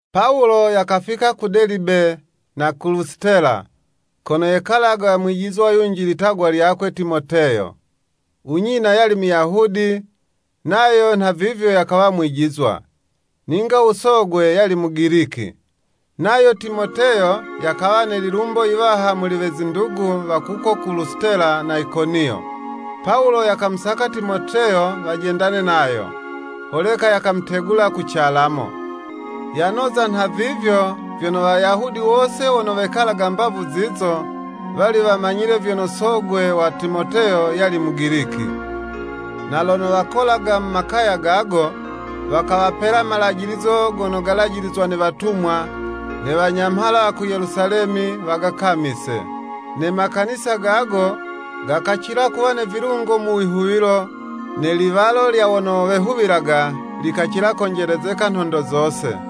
Pawulo yakafika ku Delibe, na ku Lusitela, kono yekalaga mwijizwa yunji litagwa lyakwe Timoteyo, u nyina yali Muyahudi, nayo nhavivyo yakawa mwijizwa. Ninga u sogwe yali Mugiliki. Nayo Timoteyo yakawa ne lilumbo yiwaha muli we zindugu wa kuko ku Lusitela na Ikoniyo. Pawulo yakamusaka Timoteyo wajendane nayo, holeka yakamutegula ku calamo. Yanoza nhavivyo, vyono Wayahudi wose wono wekalaga mbavu zizo, wali wamanyile vyono sogwe wa Timoteyo yali Mugiliki. Na lono wakolaga mu makaya gago, wakawapela malajilizo gono galajilizwa ne watumwa, ne wanyamhala wa ku Yelusalemi, wagakamise. Ne Makanisa gago gakacila kuwa ne vilungo mu wihuwilo, ne liwalo lya wono wehuwilaga, likacila konjelezeka nhondo zose.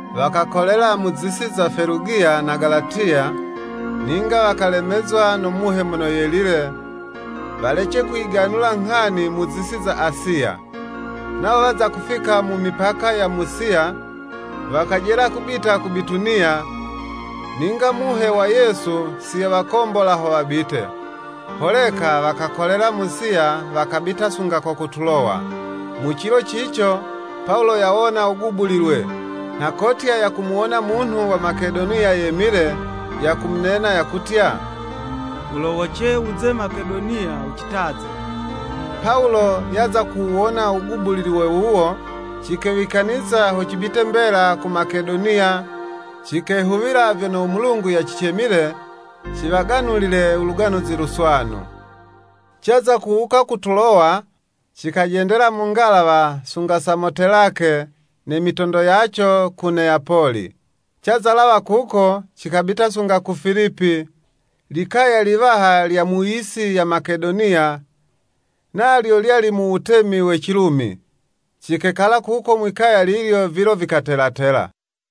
Wakakolela mu zisi za Felugiya na Galatiya, ninga wakalemezwa no Muhe Mono Yelile, walece kuyiganula nghani mu zisi za Asiya. Nawo waza kufika mu mipaka ya Musiya, wakajela kubita ku Bituniya, ninga Muhe wa Yesu si yawakombola ho wabite. Holeka wakakolela Musiya wakabita sunga ko ku Tulowa. Mu cilo cico, Pawulo yawona wugubulilwe, nha kotya yakamuwona munhu wa Makedoniya yemile, yakumunena, yakutya, “Wulowoce wuze Makedoniya wucitaze.” Pawulo yaza kuwuwona wugubulilwe wuwo, cikewikaniza ho cibite mbela ku Makedoniya, cikehuwila vyono u Mulungu yacicemile ciwaganulile u Luganuzi Luswanu. Caza kuwuka ku Tulowa, cikajendela mu ngalawa sunga Samotelake, ne mitondo yaco, ku Neyapoli. Caza lawa kuko, cikabita sunga ku Filipi, likaya liwaha lya mu yisi ya Makedoniya, nalyo lyali mu wutemi we Cilumi. Cikekala kuko mwi'kaya lilyo vilo vikatelatela.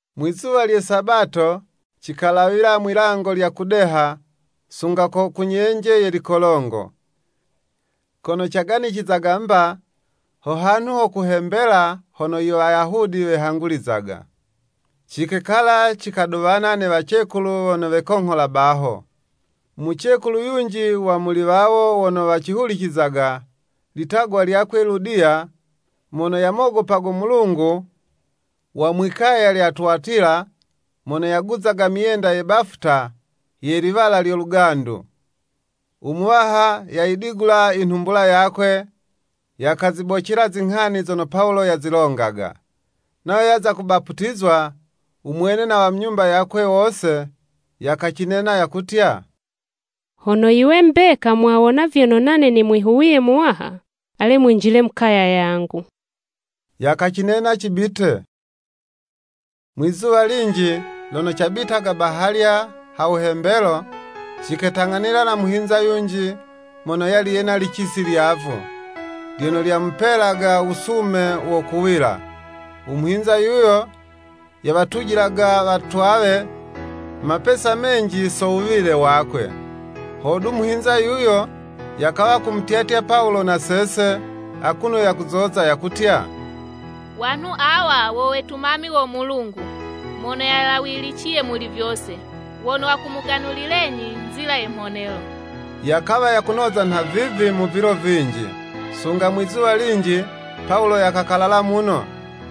Mwi'zuwa lye Sabato, cikalawila mwi'lango lya kudeha, sunga ku nyenje ye likolongo, kono caganicizaga mba, ho hanhu ho kuhembela, hono i Iwayahudi wehangulizaga. Cikekala cikaduwana ne wacekulu wono wekonghola baho. Mucekulu yunji wa muli wawo wono wacihulicizaga, litagwa lyakwe Ludiya, mono yamogopago Mulungu, wa mwi'kaya lya Tuwatila, mono yaguzaga myenda ye bafuta, ye liwala lyo lugandu. U Muwaha yayidigula inhumbula yakwe, yakazibocela zinghani zono Pawulo yazilongaga. Nayo yaza kubaputizwa, u mwene na wa mu nyumba yakwe wose, yakacinena yakutya, “Hono yiwe mbeka mwawona vyono nane nimwihuwiye Muwaha, ale mwinjile mu kaya yangu.” Yakacinena cibite. Mwizuwa linji, lono cabitaga bahalya ha wuhembelo, ciketang'anila na muhinza yunji, mono yali yena licisi lyavu, lyono lyamupelaga wusume wo kuwila. U muhinza yuyo, yawatujilaga watwawe mapesa menji so wuwile wakwe. Hodu, muhinza yuyo, yakawa kumutyatya Pawulo na sese, akuno yakuzoza, yakutya, “Wanhu awa wo wetumami wo Mulungu Mono yalawiliciye Muli vyose, wono wakumuganulilenyi nzila ye mhonelo.” Yakawa yakunoza nhavivi mu vilo vinji. Sunga mwizuwa linji, Pawulo yakakalala muno,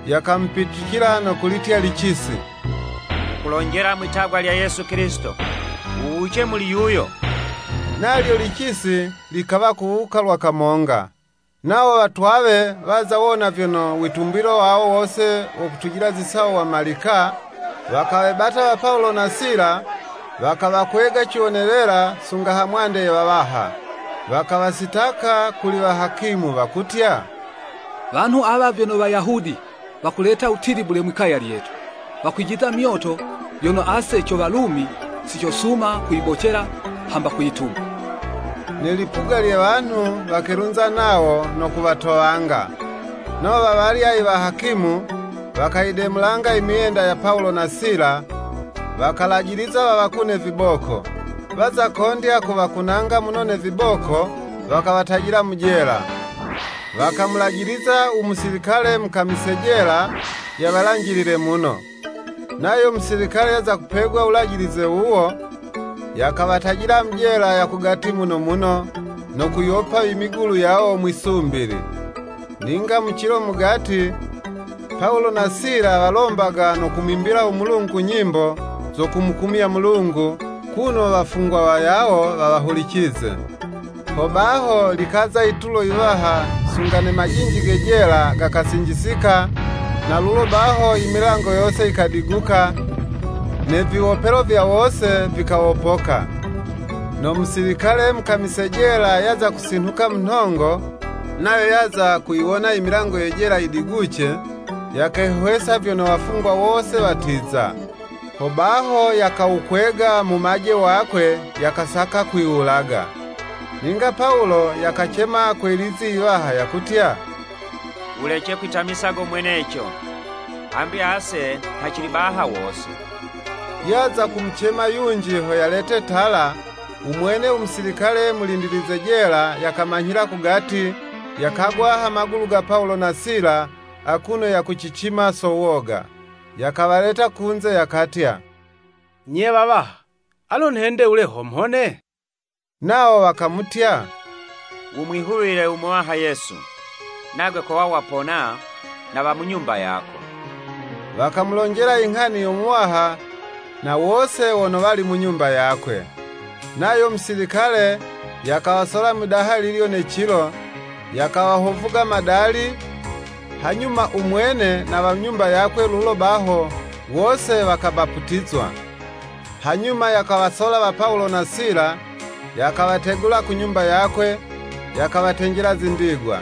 yakamupitucila no kulitya licisi, “Nghukulonjela, mwi'tagwa lya Yesu Kilisito, wuwuce muli yuyo.” Nalyo licisi likawa kuwuka lwa kamonga. Nawo watwawe waza wona vyono witumbilo wawo wo kutujila zisawo wamalika, wakawebata wa Pawulo na Sila, wakawakwega ciwonelela sunga hamwande ye wawaha. Wakawasitaka kuli wahakimu, wakutya, “Wanhu awa vyono Wayahudi, wakuleta wutilibule mwi'kaya lyetu. Wakwijiza myoto yono ase co Walumi, si cosuma kuyibocela, hamba kwituma.” Ne lipuga lye wanhu wakelunza nawo, no kuwatowanga. Nawo wawalya iwahakimu, wakayidemulanga i myenda ya Pawulo na Sila, wakalajiliza wawakune viboko. Waza kondya kuwakunanga muno ne viboko, wakawatajila mu jela, wakamulajiliza u musilikale mukamise jela, yawalanjilile muno. Nayo musilikale yaza kupegwa wulajilize wuwo, yakawatajila mu jela ya kugati muno muno, no kuyiwopa imigulu yawo mwi'sumbili. Ninga mu cilo mugati, Pawulo na Sila walombaga no kumwimbila u Mulungu nyimbo, zo kumukumya Mulungu, kuno wafungwa wayawo wawahulicize. Ho baho likaza yitulo yiwaha, sunga ne majinji ge jela, gakasinjisika, na lulo baho, i milango yose yikadiguka, ne viwopelo vya wose vikawopoka. No musilikale mukamise jela yaza kusinhuka mu nhongo, nayo yaza kuyiwona imilango ye jela yidiguce, yakehwesa vyono wafungwa wose watiza. Hobaho yakawukwega mumaje wakwe, yakasaka kwiwulaga. Ninga Pawulo yakacema kwe lizi yiwaha yakutya, “Wulece kwitamisa go mweneco, hambi ase nha cili baha wose.” Yaza kumucema yunji ho yalete tala, u mwene u musilikale mulindilize jela yakamanyhila kugati, yakagwa ha magulu ga Pawulo na Sila akuno yakucicima so woga. Yakawaleta kunze, yakatya “Nye wawaha, alo nhende wule ho mhone?” Nawo wakamutya, “Wumwihuwile u Muwaha Yesu, nagwe kowa wapona, na wa mu nyumba yako.” Wakamulonjela inghani yo Muwaha, na wose wono wali mu nyumba yakwe. Nayo musilikale, yakawasola mwidaha lilyo ne cilo, yakawahovuga madali, hanyuma u mwene na wa mu nyumba yakwe lulo baho wose wakabaputizwa. Hanyuma yakawasola wa Pawulo na Sila, yakawategula ku nyumba yakwe, yakawatenjela zindigwa.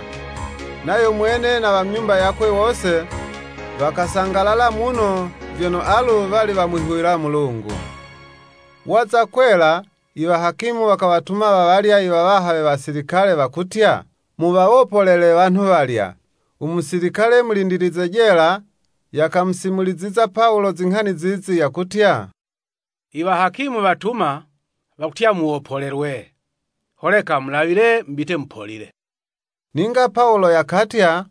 Nayo mwene na wa mu nyumba yakwe wose, wakasangalala muno, vyono alu, wali wamwihuwila Mulungu. Waza kwela, iwahakimu wakawatuma wawalya iwawaha we wasilikale, wakutya, “Muwawopolele wanhu walya.” U musilikale mulindilize jela, yakamusimuliziza Pawulo zinghani zizi, yakutya, “Iwahakimu watumwa, wakutya muwopolelwe. Holeka mulawile mubite mupolile.” Ninga Pawulo yakatya,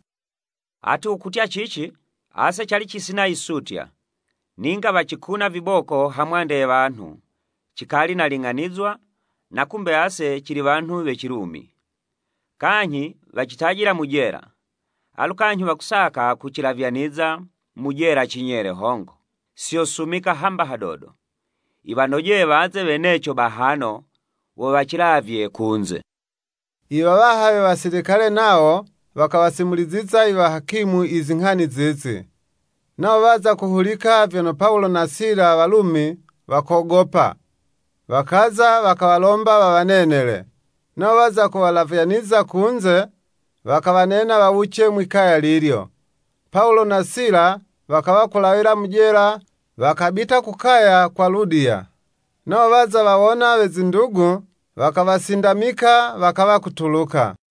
“Ati wukutya cici? Ase cali cisina yisutya, ninga wacikuna viboko hamwande ye wanhu cikali naling'anizwa na kumbe ase cili wanhu we Cilumi. Kanyhi wacitajila mu jela, alu kanyhi wakusaka kucilavyaniza mu jela cinyele hongo? Si yosumika hamba hadodo. Yiwanojeye waze weneco bahano, wo wacilavye kunze.” Iwawaha we wasilikale nawo wakawasimuliziza iwahakimu izinghani zizi. Nawo waza kuhulika vyono Pawulo na Sila, walumi, wakogopa. Wakaza wakawalomba wawanenele, nawo waza kuwalavyaniza kunze, wakawanena wawuce mwi'kaya lilyo. Pawulo na Sila, wakawa kulawila mu jela wakabita ku kaya kwa Ludiya. Nawo waza wawona we zindugu, wakawasindamika, wakawa kutuluka.